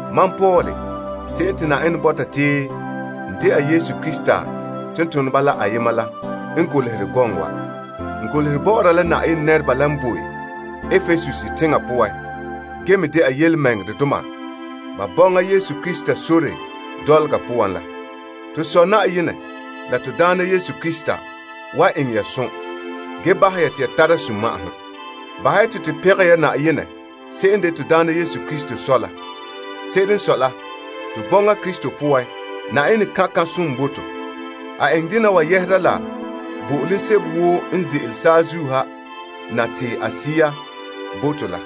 Mam Paul se'em te Yenɛ bɔta te n dɛna Krista Yesu tontoneba la yema la n golehɛ gɔŋɔ wa. N golehɛ bɔ'ɔra la Yenɛ nɛreba la n boe Epesus teŋa poan ge me dɛna birikindoma ba bɔŋa Krista Yesu sore dɔlɔga poan la. To Sɔ Yenɛ la Na'ayenɛ Yesu Krista wan eŋɛ ya som ge bahɛ ya te ya tara sunma'ahom. Bahɛ ya te to bo Yenɛ n de to Na'ayenɛ Yesu Krista Sɔ la fara. Se'ere n sɔe la, to bɔŋa Krista poan, Yenɛ kan' kan'somɔ bo to. A eŋɛ dena wa yɛhera la bo'olom sebo woo n ze'ele saazuo ha na te a Sea bo to la.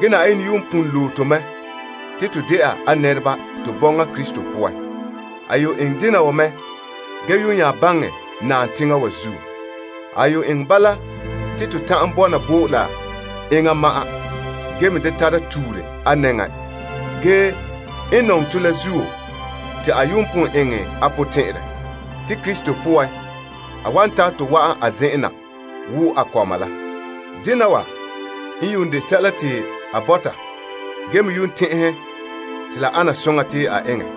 Ge Na'ayenɛ yuun pon lo'e to mɛ te to dɛna a nɛreba to bɔŋa Krista poan. A yuun eŋɛ dena wa mɛ ge yuun nya baŋɛ naam teŋa wa zuo. A yuun eŋɛ bala te to ta'an bɔna bo la enŋa ma'an ge me da tara tuure a nɛŋa. N nɔŋɛ tɔ la zuo, te a yuun pon eŋɛ a potɛn'ɛrɛ te Yesu Krista poan, a wan tare tɔ wa'an a zen'en na te to dɛna a kɔma. Dena wa n yuun de sɛla te a bɔta ge me yuun tɛn'ɛhɛ te la ana soŋa te a eŋɛ.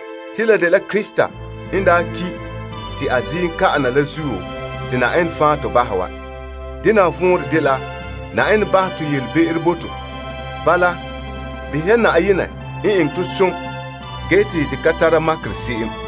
Te la dela Krista n daa ki' te a ziim ka'ɛ na la zuo te Na'ayenɛ fan' to bahɛ wa. Dena wa vɔnrɛ dela Na'ayenɛ bahɛ to yelebe'ero bo to. Bala, behɛ ya Yenɛ zo'ohogɔ n zo'e se'em,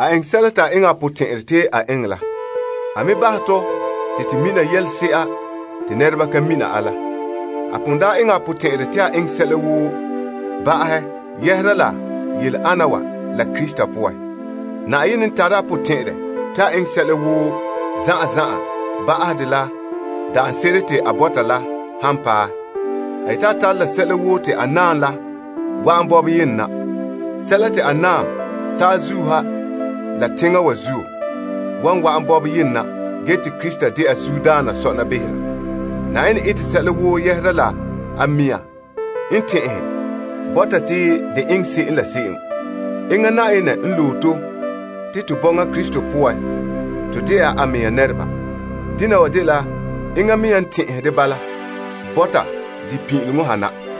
te a eŋɛ a potɛn'ɛrɛ te a eŋɛ la. A me bahɛ tɔ te to mina yelese'a te nɛreba ka mina a la. A pon daa eŋɛ a potɛn'ɛrɛ te a eŋɛ sɛla woo ba'ahɛ doohe la Krista poan. Yenɛ n tare a potɛn'ɛrɛ te a eŋɛ sɛla woo zan'an zan'an ba'ahɛ dela daanse'ere daarɛ te a bɔta la han paɛ, a yete a tare la sɛla woo te a naam la wa'an bɔberɛ yenɛ na. Sɛla te a naam saazuo ha la la teŋa wa zuo wan wa'an bɔberɛ yenɛ na ge te Krista dɛna zuodaana sɔna behera. Yenɛ ete sɛla woo yɛhera la a mɛŋa n tɛn'ɛhɛ bɔta te de eŋɛ se'em la se'em. Enŋa Yenɛ n loe to te to bɔŋa Krista poan, to dɛna a mɛŋa nɛreba. Dena wa dela enŋa mea n tɛn'ɛhɛ de bala bɔta de pin'ileŋɔ ha na.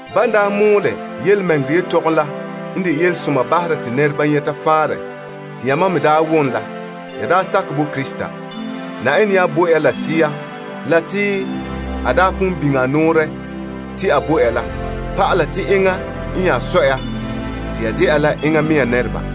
Ban daa mɔɔlɛ yelemɛŋɛrɛ yetɔgom la n de yelesoma bahera te nɛreba nyɛta faanrɛ te yamam me daa wom la, ya daa sakɛ bo Krista. Na'ayenɛ nya bo ya la a Sea la te a daa pon biŋe a nɔɔrɛ te a bo ya la pa'ala te enŋa n nya sɔe ya te ya dela a mɛŋa nɛreba.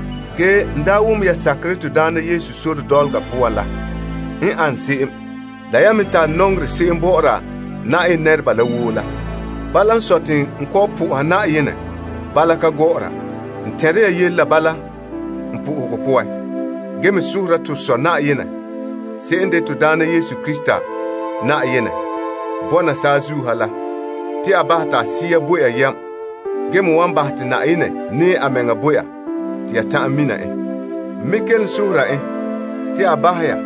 Ge n daa wom ya sakerɛ Na'ayenɛ Yesu sore dɔlɔga poan la n ane se'em, la yan me tare nɔŋerɛ se'em bɔ'ɔra Yenɛ nɛreba la woo la. Bala n sɔe, te n kɔ'ɔn bɔ'ɔra Na'ayenɛ fara saŋa woo ya zuo. N tɛnre ya yele la bala n po'ohegɔ poan, ge me sohora to Na'ayenɛ Yesu Krista Yenɛ eŋɛ la n de Sɔ ge dɛna paŋadaana la te a bahɛ te a Sea la bo ya yam, ge bahɛ te Yenɛ nɛɛ a mɛŋa bo ya te ya ta'an mina en. N me kelom sohora en te a bahɛ ya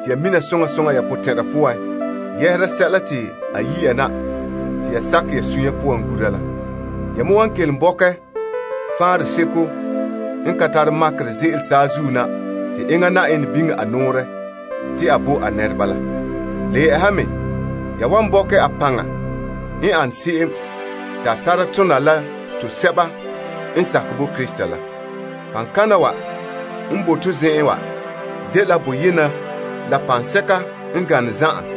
te ya mina soŋa soŋa ya potɛn'ɛra poan yɛhera sɛla te a yi' ya na te ya sakɛ ya sunya poan gura la. Ya me wan kelom bɔkɛ faanrɛ seko n ka tare makerɛ ze'ele saazuo na te enŋa Yenɛ biŋe a nɔɔrɛ te a bo a nɛreba la. Le yɛ'ɛha me, ya wan bɔkɛ a paŋa n ane se'em te a tara tona la to sɛba n sakɛ bo Krista la. Paŋkana wa n boe to zen'en wa dela boyena la paŋsɛka n gane zan'an,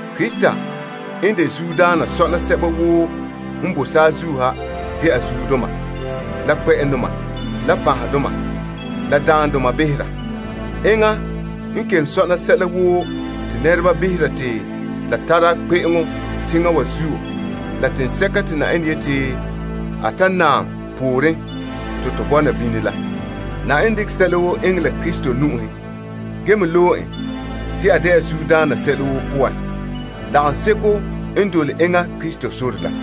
Krista n de zuodaana sɔna sɛba woo n boe saazuo ha dɛna zuodoma, la kpɛ'ɛndoma, la panhedoma, la daandoma behera. Enŋa kelom sɔna sɛla woo te nɛreba behera te la tare kpe'eŋo teŋa wa zuo la teŋsɛka te Yenɛ yeti a ta naam pooren te to bɔna bini la. Yenɛ dekɛ sɛla woo eŋɛ la Krista nu'uhen ge me loe en te a dɛna zuodaana sɛla woo poan lagaŋseko n dole enŋa Krista sore la.